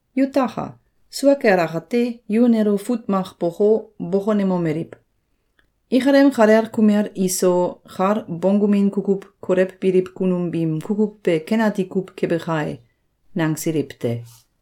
Yutaka! Sua kel akate, yu nelo fut mak boko, bokonemomeliw: “Ikalem kalel kumel iso kal bonggumin kukuw kolewbiliw kunum biim kukuw be ken ati kuw kebe kai.”, nangsiliw te.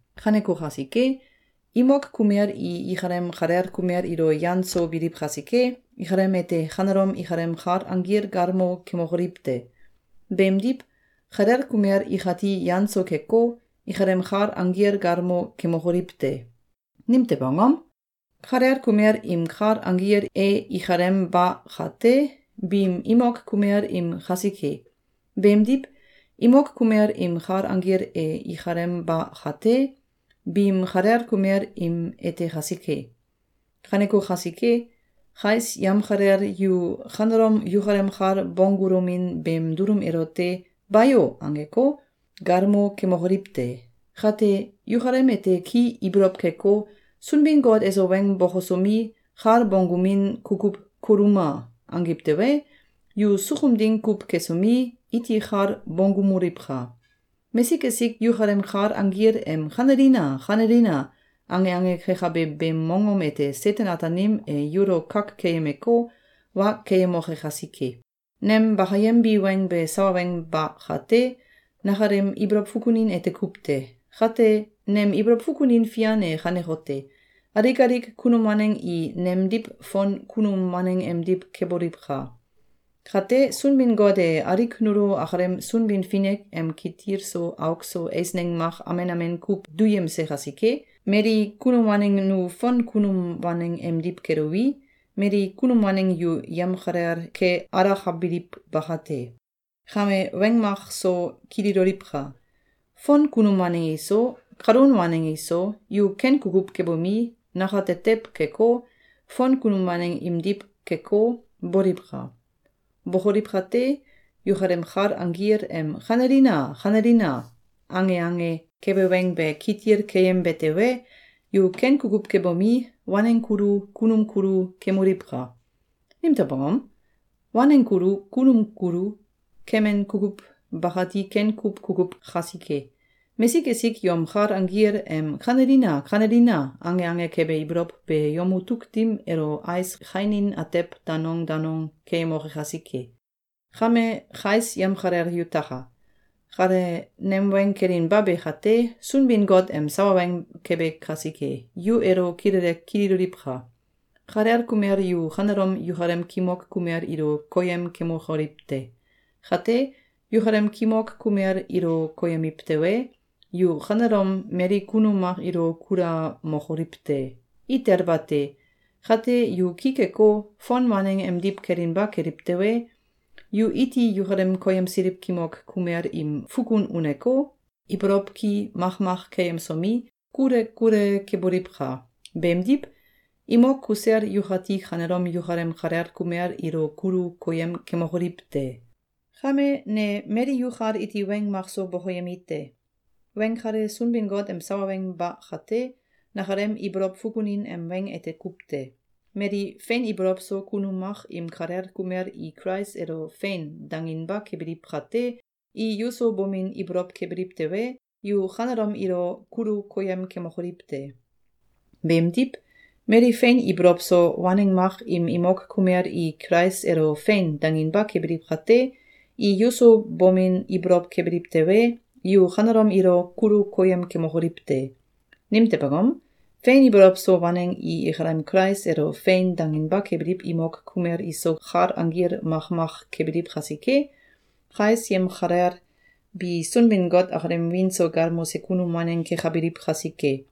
Kaneko kasike, imok kumel i ikalem kalel kumel ilo yan so biliw kasike, ikalem ete kanelom ikalem kal anggil galmo kemokoliw te! Beemdiw, kalel kumel ikati yan so keko, ikalem kal anggil galmo kemokoliw te! Nimtew angom? Kalel kumel im kal anggil e ikalem ba kate, biim imok kumel im kasike. Beemdiw, imok kumel im kal anggil e ikalem ba kate, biim kalel kumel im ete kasike. Kaneko kasike, kais yamkalel yu kanelom yukalem kal bonggulomin beem dulum elote “Bayo!”, angeko, galmo kemokoliw te! Kate, yukalem ete ki ibolow keko, “Sunbin-Got eso weng bokosomi, kal bonggumin kukuw koluma!”, angiw tewe, yu sukum ding kuw kesomi, iti kal bonggumoliwka! Mesik esik yukalem kal anggil em “Kanelina! Kanelina!”, ange ange kekabe beem mongom ete Seten-Ataanim e yulo kak keyemeko, wa keyemoke kasike. Nem bakayembi weng be sawa weng ba kate, nakalem ibolow fukunin ete kuw te. Kate, nem ibolow fukunin fian e kanekote: Alik alik kunum waneng i nemdiw fon kunum waneng emdiw keboliwka! Kate, Sunbin-Got e alik nulo akalem Sunbin-Finik em kitil so auk so eisneng mak amen amen kuw duyemse kasike, mali kunum waneng nu fon kunum waneng emdiw keluwi, mali kunum waneng yu yamkalel ke alakabiliw bakate. Kame weng mak so kililoliwka! Fon kunum waneng iso, kalun waneng iso, yu ken kukuw kebomi, nakatetew keko, fon kunum waneng imdiw keko, boliwka! Bokoliw kate, yukalem kal anggil em “Kanelina! Kanelina!”, ange ange kebe weng be kitil keyembe tewe, yu ken kukuw kebomi, waneng kulu, kunum kulu kemoliwka! Nimtew angom? Waneng kulu, kunum kulu, kemin kukuw bakati ken kuw kukuw kasike. Mesik esik yom kal anggil em “Kanelina! Kanelina!”, ange ange kebe ibolow be yom mutuk dim elo ais kainin atew danong danong keyemoke kasike. Kame kais yamkalel yutaka! Kale nem weng kelinba be kate, Sunbin-Got em sawa weng kebe kasike, yu elo kilele kililoliwka! Kalel kumel yu kanelom yukalem kimok kumel ilo koyem kemokoliw te! Kate, yukalem kimok kumel ilo koyemiw tewe, yu kanelom mali kunum mak ilo kulamokoliw te! Itel bate! Kate, yu ki keko, fon waneng emdiw kelinba keliw tewe, yu iti yukalem koyemsiliw kimok kumel im fukun uneko, ibolow ki makmak keyemsomi, kule kule keboliwka! Beemdiw, imok kusel yukati kanelom yukalem kalel kumel ilo kulu koyem kemokoliw te! Kame ne mali yukal iti weng makso bokoyemi te. Weng kale Sunbin-Got em sawa weng ba kate, nakalem ibolow fukunin em weng ete kuw te. Mali fein ibolow so kunum mak im kalel kumel i Kulais elo “Fein!”, danginba kebiliw kate, i yuso bomin ibolow kebiliw tewe, yu kanelom ilo kulu koyem kemokoliw te! Beemdiw, mali fein ibolow so waneng mak im imok kumel i Kulais elo “Fein!”, danginba kebiliw kate, i yuso bomin ibolow kebiliw tewe, yu kanelom ilo kulu koyem kemokoliw te! Nimtew angom? Fein ibolow so waneng i ikalem Kulais elo “Fein!”, danginba kebiliw imok kumel iso kal anggil makmak kebiliw kasike, kais yamkalel bi Sunbin-Got akalem wiin so galmose kunum waneng kekabiliw kasike.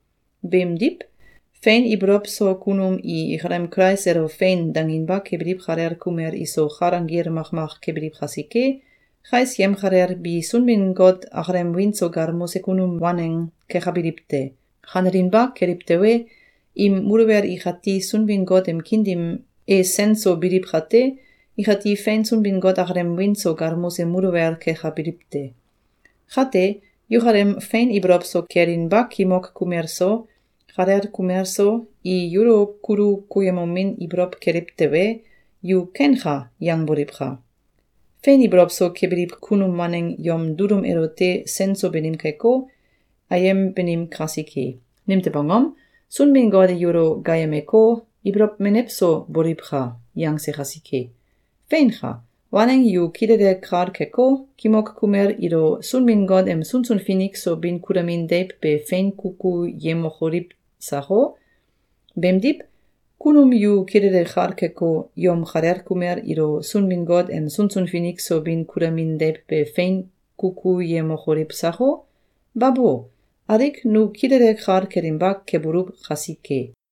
Beemdiw, fein ibolow so kunum i ikalem Kulais elo “Fein!”, danginba kebiliw kalel kumel iso kal anggil makmak kebiliw kasike, kais yamkalel bi Sunbin-Got akalem wiin so galmose kunum waneng kekabiliw te. Kanelinba keliw tewe, im muluwel ikati Sunbin-Got em kiin dim e sen so biliw kate, ikati fein Sunbin-Got akalem wiin so galmose muluwel kekabiliw te. Kate, yukalem fein ibolow so kelinba kimok kumel so, kalel kumel so, i yulo kulu koyemomin ibolow keliw tewe, yu “Kenka!”, yangboliwka! Fein ibolow so kebiliw kunum waneng yom dulum elote sen so banim keko, ayem banim kasike. Nimtew angom? Sunbin-Got e yulo gaayemeko, “Ibolow menew so boliwka!”, yangse kasike. Feinka! Waneng yu kilele kal keko, kimok kumel ilo Sunbin-Got em sunsun finik so bin kulamin deiw be fein kukuyemokoliw sako? Beemdiw, kunum yu kilele kal keko, yom kalel kumel ilo Sunbin-Got em sunsun finik so bin kulamin deiw be fein kukuyemokoliw sako? Babo! Alik nu kilele kal kelinba kebuluw kasike.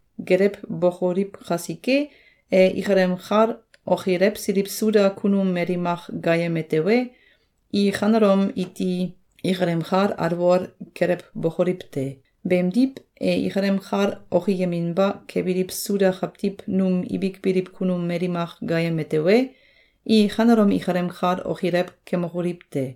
Gelewbokoliw kasike, e ikalem kal okilewsiliw Suda kunum mali mak gaayeme tewe, i kanelom iti ikalem kal alwol kelewbokoliw te! Beemdiw, e ikalem kal okiyeminba kebiliw Suda kawtiw num ibik biliw kunum mali mak gaayeme tewe, i kanelom ikalem kal okilew kemokoliw te!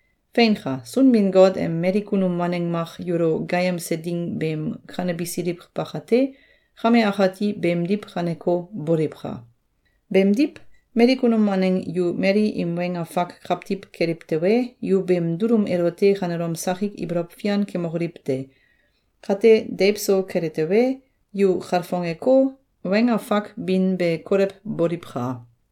Feinka! Sunbin-Got em mali kunum waneng mak yulo gaayemse ding beem kanebisiliw bakate, kame akati beemdiw kaneko, boliwka! Beemdiw, mali kunum waneng yu mali im weng afak kawtiw keliw tewe, yu beem dulum elote kanelom sakik ibolow fian kemokoliw te! Kate, deiw so kele tewe, yu kalfongeko, weng afak bin be kolewboliwka!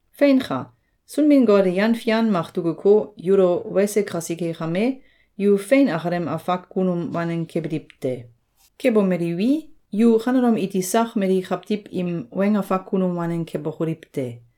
Feinka! Sunbin-Got e yan fian mak dukuko, yulo wese kasike kame, yu fein akalem afak kunum waneng kebiliw te. Kebomeliwi, yu kanelom iti sak mali kawtiw im weng afak kunum waneng kebokoliw te!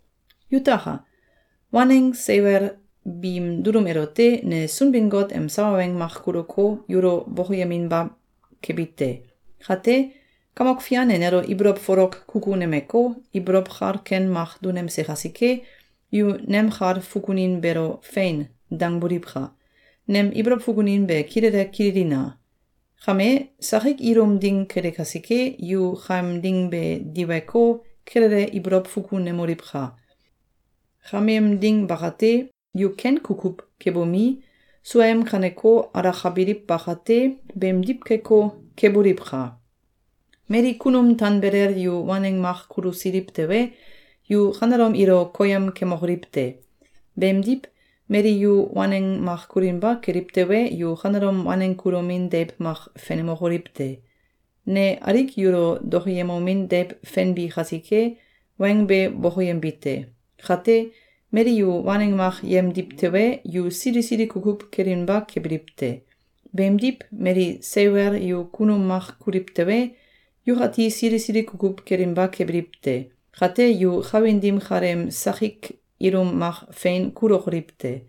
Yutaka! Waneng seiwel biim dulum elote ne Sunbin-Got em sawa weng mak kuluko, yulo bokoyeminba kebi te. Kate, Kamok Fian e nelo ibolow folok kukunemeko, ibolow kal ken mak dunemse kasike, yu nem kal fukunin beelo “Fein!”, dangboliwka! Nem ibolow fukunin be kilele kililina! Kame, sakik ilum ding kele kasike, yu kameem ding be diweko, kilele ibolow fukunemoliwka! Kameem ding bakate, yu ken kukuw kebomi, suaem kaneko alakabiliw bakate, beemdiw keko, keboliwka! Mali kunum tanbelel yu waneng mak kulusiliw tewe, yu kanelom ilo koyem kemokoliw te! Beemdiw, mali yu waneng mak kulinba keliw tewe, yu kanelom waneng kulomin deiw mak fenemokoliw te! Ne alik yulo dokoyemomin deiw fenbi kasike, weng be bokoyembi te. Kate, mali yu waneng mak yemdiw tewe, yu sili sili kukuw kelinba kebiliw te. Beemdiw, mali seiwel yu kunum mak kuliw tewe, yukati sili sili kukuw kelinba kebiliw te. Kate yu kawin dim kaleem sakik ilum mak fein kulokoliw te.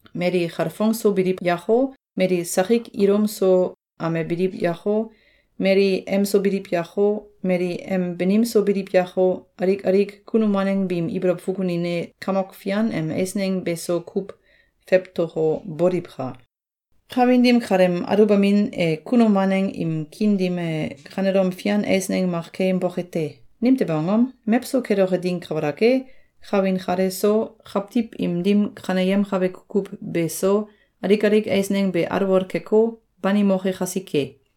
Mali kalfongso biliw yako, mali sakik ilum so amebiliw yako, mali em so biliw yako, mali em banim so biliw yako, alik alik kunum waneng biim ibolow fukunin e Kamok Fian em eisneng beso kuw fewtoko, boliwka! Kawin dim kaleem aluwbamin e kunum waneng im kiin dim e kanelom fian eisneng mak keyemboke te! Nimtew angom? Mewso keloke ding kabalak e, kawin kale so, kawtiw im dim kaneyemkabe kukuw beso, alik alik eisneng be alwol keko, banimoke kasike.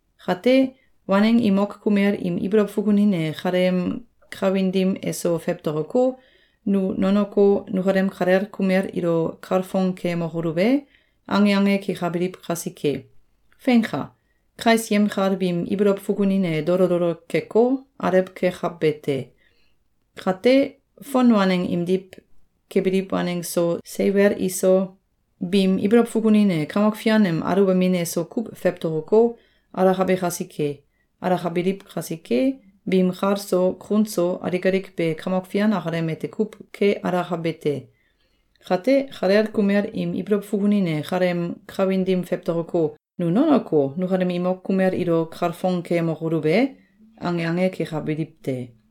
Kate, waneng imok kumel im ibolow fukunin e kaleem kawin dim eso fewtokoko, “Nu nonoko, nukalem kalel kumel ilo kalfong keyemokoluw e?”, ange ange kekabiliw kasike. Feinka! Kais yemkal biim ibolow fukunin e dolo dolo keko, alew kekabe te. Kate, fon waneng imdiw kebiliw waneng so, seiwel iso, biim ibolow fukunin e Kamok Fian em aluwbamin eso kuw fewtokoko, alakabe kasike. Alakabiliw kasike, biim kal so, kun so, alik alik be Kamok Fian akalem ete kuw ke alakabe te. Kate, kalel kumel im ibolow fukunin e kaleem kawin dim fewtokoko, “Nu nonoko, nukalem imok kumel ilo kalfong keyemokoluw e?”, ange ange kekabiliw te.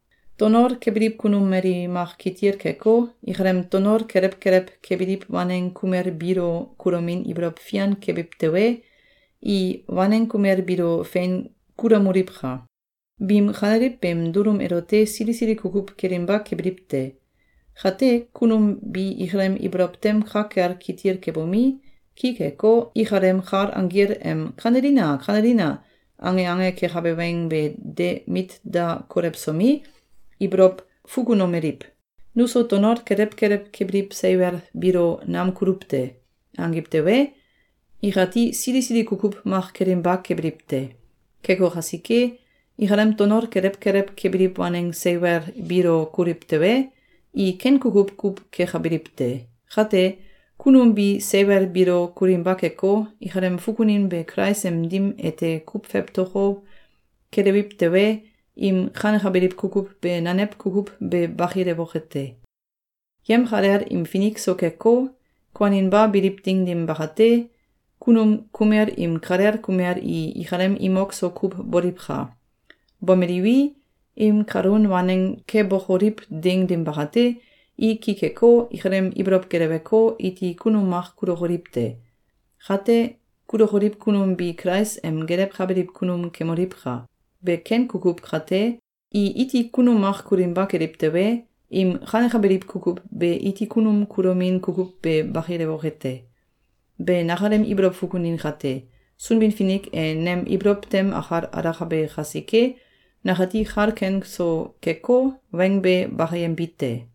Tonol kebiliw kunum mali mak kitil keko, ikalem tonol kelew kelew kebiliw waneng kumel biilo kulomin ibolow fian kebiw tewe, i waneng kumel biilo fein kulamoliwka! Biim kaneliw beem dulum elote sili sili kukuw kelinba kebiliw te. Kate, kunum bi ikalem ibolow tem ka kel kitil kebomi, ki keko, ikalem kal anggil em “Kanelina! Kanelina!”, ange ange kekabe weng be de mit da kolewsomi, ibolow fukunomeliw: “Nuso tonol kelew kelew kebiliw seiwel biilo nam kuluw te!”, angiw tewe, ikati sili sili kukuw mak kelinba kebiliw te. Keko kasike, ikalem tonol kelew kelew kebiliw waneng seiwel biilo kuliw tewe, i ken kukuw kuw kekabiliw te. Kate, kunum bi seiwel biilo kulinba keko, ikalem fukunin be Kulais em dim ete kuw fewtoko, kelewiw tewe, im kanekabiliw kukuw be nanew kukuw be bakilewoke te. Yemkalel im finik so keko, kuaninba biliw ding dim bakate, kunum kumel im kalel kumel i ikalem imok so kuw boliwka! Bomeliwi, im kalun waneng kebokoliw ding dim bakate, i ki keko, ikalem ibolow geleweko, iti kunum mak kulokoliw te. Kate, kulokoliw kunum bi Kulais em gelewkabiliw kunum kemoliwka! Be ken kukuw kate, i iti kunum mak kulinba keliw tewe, im kanekabiliw kukuw be iti kunum kulomin kukuw be bakilewoke te. Be nakalem ibolow fukunin kate, Sunbin-Finik e nem ibolow tem akal alakabe kasike, nakati kal ken so keko, weng be bakayembi te.